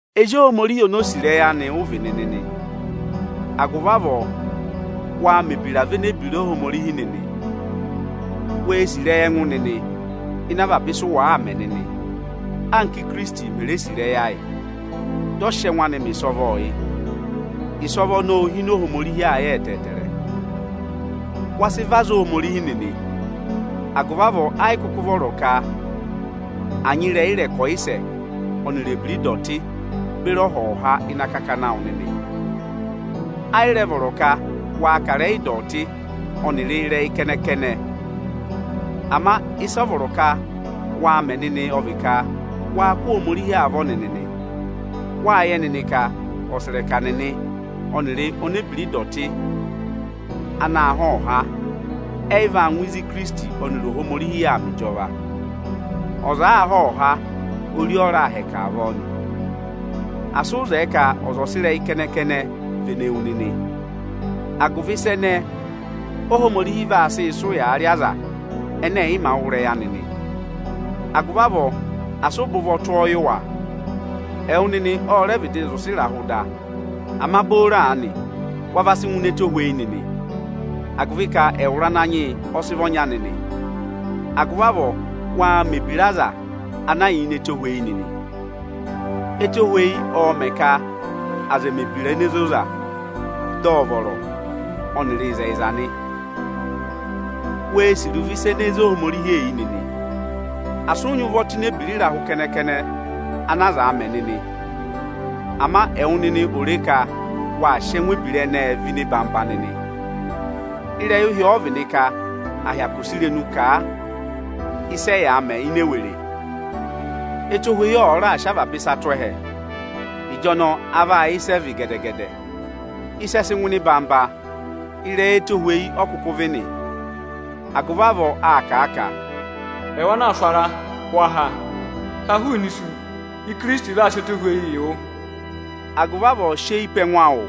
Ezi Ohomorihi oni o sì ịrẹyị anị ụ vị nịnị nị. Agụvị avọọ, waa mẹ ebiraa véné ebira Ohomorihi nịnị. Wee sì ịrẹyị ẹngụ nịnị ịnị avaba ịsa ọnị ụ wàaa mẹ nịnị, anka Íkirisiti mè re sì ịrẹyị ayị, dị ọ sị ẹngụ anị mẹ ịsọvọọ yị. Ịsọvọ ọnọọ óo hine Ohomorihi ayị ẹtẹẹtẹrẹ. Wa sị vị aza Ohomorihi nịnị; agụvị avọọ ẹ yị kụkụ vọrọ ka à nyị ịrẹyị ịrẹkọyịsẹ ọnịrị ebira ịdọtị beri ọhọha ịnị akakana awụ nịnị. Ẹ yị rẹ vọrọ ka waa kà ịrẹyị ịdọtị ọnịrị ịrẹyị kẹnẹ-kẹnẹ nịnị. Ama ịsị a vọrọ ka waa mẹ nịnị ọ vị ka waa kụ́ Ohomorihi avọ nịnị nị. Wáa yẹ nịnị ka ọsẹrẹka nịnị ọnịrị onebira ịdọtị anaā há ọhọha, ẹyị vaa ngụ ịzị Ikirisiti ọnịrị Ohomorihi yà aa mẹ ịjọva. Ọza àaa há ọhọha, ori ọ raa hẹkẹ avọọ nị. Asị ụ zẹẹ ka ọza ọ̀ sị ịrẹyị kẹnẹ-kẹnẹ vene wu nịnị! Agụvị ịsa ẹnẹẹ Óhomorihi vaa sị sị ụyaa rị aza ẹnẹ ẹ̀ yị mā wụ́ ịrẹyị anị nị. Agụvị avọọ, asị ụ bẹ ụvọ tụ́ ọọ yị wa! Ẹwụ nịnị ọ rẹ vịdị zị ụsẹ ịrahụ da, ama booro aanị wa va sị ngụ ini ẹtohweyi nịnị, agụvị ka ẹwụrị Ananyị yị ọ sị vị ọnya nịnị. Agụvị avọọ, waa mẹ̀ ebira aza na yà ini ẹtohweyi nịnị! Etohweyi ọọ̄ mẹ̀ ka aza ẹ̀ẹ mẹ̀ ebira ene zoza, dị ọ vọrọ, ọnịrị ịzẹyịza nị. Wee sì iruvo ịsa ene zé Ohomorihi eyi nịnị! Asị ụ nyị ụvọ tụ́ ini ebira ịrahụ kẹnẹ-kẹnẹ ana aza aa mẹ nịnị! Ama ẹwụ nịnị ò re ka wáa sị ẹngụ ebira ẹnẹẹ vẹ ịnị ịnọyị-ịnọyị nịnị! Ịrẹyị ụhị ọ vị nị ka à hyakụ sị irenu kà a ịsị ẹyaa mẹ ini ewere. Etohweyi ọ̀ọ raà sị avaba ịsa tụ́ ẹhẹ, ịjọnọọ a vaa yẹ ịsị ẹ vị gẹdẹ-gẹdẹ. Ịsị ẹ̀ẹ sị ngụ ịnị ịnọyị-ịnọyị, ịrẹyị ẹtohweyi ọ kụkụ vị nị. Agụvị avọọ a kà a ka, “Ẹwụ ana aa sụ ara, wa ha! Ha hụụnị isu, Ikirisiti vaa sị ẹtohweyi yị wụ!” Agụvị avọọ sị eyi pe ẹngụ awụ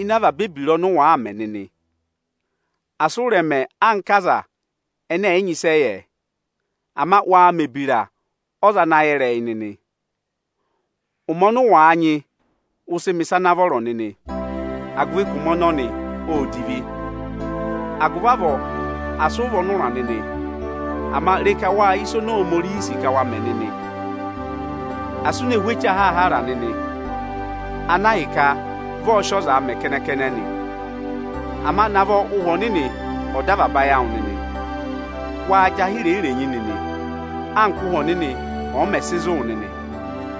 ịnị avaba ebira ọnị ụ waa mẹ nịnị! Asị ụ rẹ̀ mẹ anka aza ẹnẹ ẹ̀ yị nyị ịsị ẹ yẹ; ama waa mẹ̀ ebira ọza ana yẹ ịrẹyị nịnị! Ụmẹ ọnị ụ wàa nyị, ụ sị mẹ̀ ịsa ana vọrọ nịnị, agụvị ka ụmẹ ọnọnị óo divi. Agụvị avọọ asị ụ vị ọnụra nịnị, ama re ka wáa yẹ ịsa oni Ohomorihi sì ka wa mẹ nịnị! Asị u ne hú eche ahaahara nịnị, ana ahịka vị ọọ̄ sị ọzaa mẹ kẹnẹ-kẹnẹ nị, ama navọ Ụhwẹ Ọnịnị ọ̀ dọ avaba ayị awụ nịnị! Waa jị ahẹ irenyi-irenyi nịnị, anka Ụ́hwẹ Ọnịnị ọ̀ọ mẹ̀ sị zụ̀ wụ nịnị,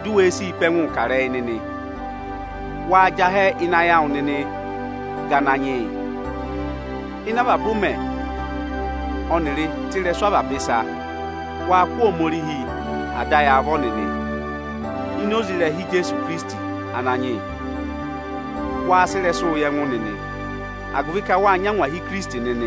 di u we sii pe ẹngụụ kà ịrẹyị nịnị! Waa jị ahẹ ịnị ayị awụ nịnịị ga Ananyị yị. Ịnị avaba ụmẹ ọnịrị tụ́ ịrẹsụ avaba ịsa, waa kụ́ Ohomorihi Ada ayị avọ nịnị ini oze ịrẹha Ijeesu Ikirisiti Ananyị yị. Waa sị ịrẹsụụ yị ẹngụ nịnị, agụvị ka wáa nyị angwahi Ikirisiti nịnị.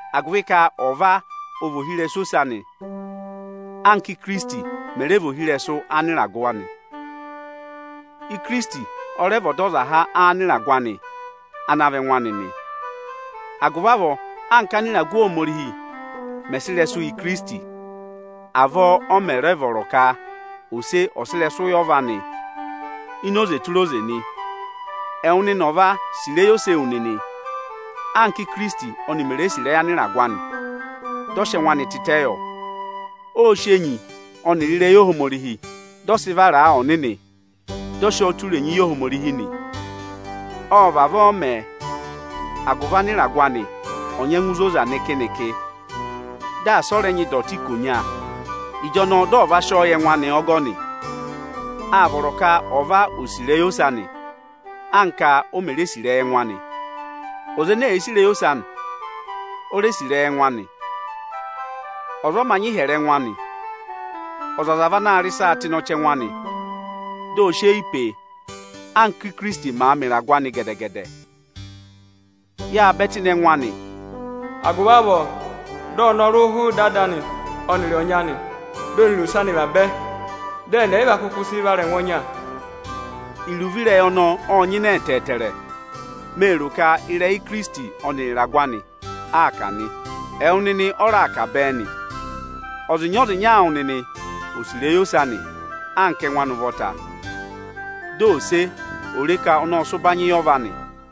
agụvị ka ọva ọ vị ohirẹsụ ose anị, anka Ikirisiti mẹ̀ rẹ vị ohirẹsụ anịragụ anị. Ikirisiti ọ rẹ vị Ọdọzaha anịragụ anị ana vị ẹngụ anị nị. Agụvị avọọ, anka ánịragụ Ohomorihi mẹ̀ sị ịrẹsụ yị Ikirisiti, avọọ ọ mẹ̀ rẹ vọrọ ka ose ọ̀ sị ịrẹsụ yị ọva anị nị ini oze tụra oze nị. Ipi 3.7Ẹwụ nịnị ọva, sì ịrẹyị ose ewu nịnị, anka Íkirisiti ọnị mè re sì ịrẹyị anịragụ anị, dị ọ sị ẹngụ anị tịtẹ yọ. Ộ sị enyi ọnịrị ịrẹyị Ohomorihi, dị ọ sị vara a ọnịnị, dị ọ sị ọọ tụ́ irenyi yị Ohomorihi nị. Ộ vavọọ mẹ, agụvị anịragụ anị ò nyengu zoza nịkị-nịkị, dị asị ọ rẹ nyị ịdọtị ikonya. Ịjọnọọ dị ọ va sị ọọ yị ẹngụ anị ọgọnị. Áa vọrọ ka ọva ò sì ịrẹyị ose anị, anka o mè re sì ịrẹyị ẹngụ anị. Ọza ene èe sì ịrẹyị ose anị, o re sì ịrẹyị ẹngụ anị. Ọza ọ mā nyị ịhyẹrẹ ẹngụ anị. Ọzọza vị anaā rị ịsaa tụ́ ịnị ọchẹngụ anị, di o si eyi pee, anka Íkirisiti màa mẹ ịragụ anị gẹdẹ-gẹdẹ. Yáa bẹ tụ́ ịnị ẹngụ anị. Agụvị avọọ dị ọnọrụ hụụ ịdị ada anị ọnịrị ọnyị anị, dị ọnịrị ose anị vabẹ, dị ẹnị ẹyịva kụkụ sị vara ẹngụ ọnya. Iruvo ireyi ọnọọ ọ́ọ nyịnẹ ẹtẹẹtẹrẹ, mee ro ka ịrẹyị Ikirisiti ọnịrị ịragụ anị aa kà nị. Ẹwụ nịnị ọ́ raa kà bẹẹ nị: ọzịnya-ọzịnya awụ nịnị ò sì ịrẹyị ose anị anka ẹngụ anị ụvọta! Dị ose ò re ka ọnị ọ́ọ sị ụbanyị yị ọva anị!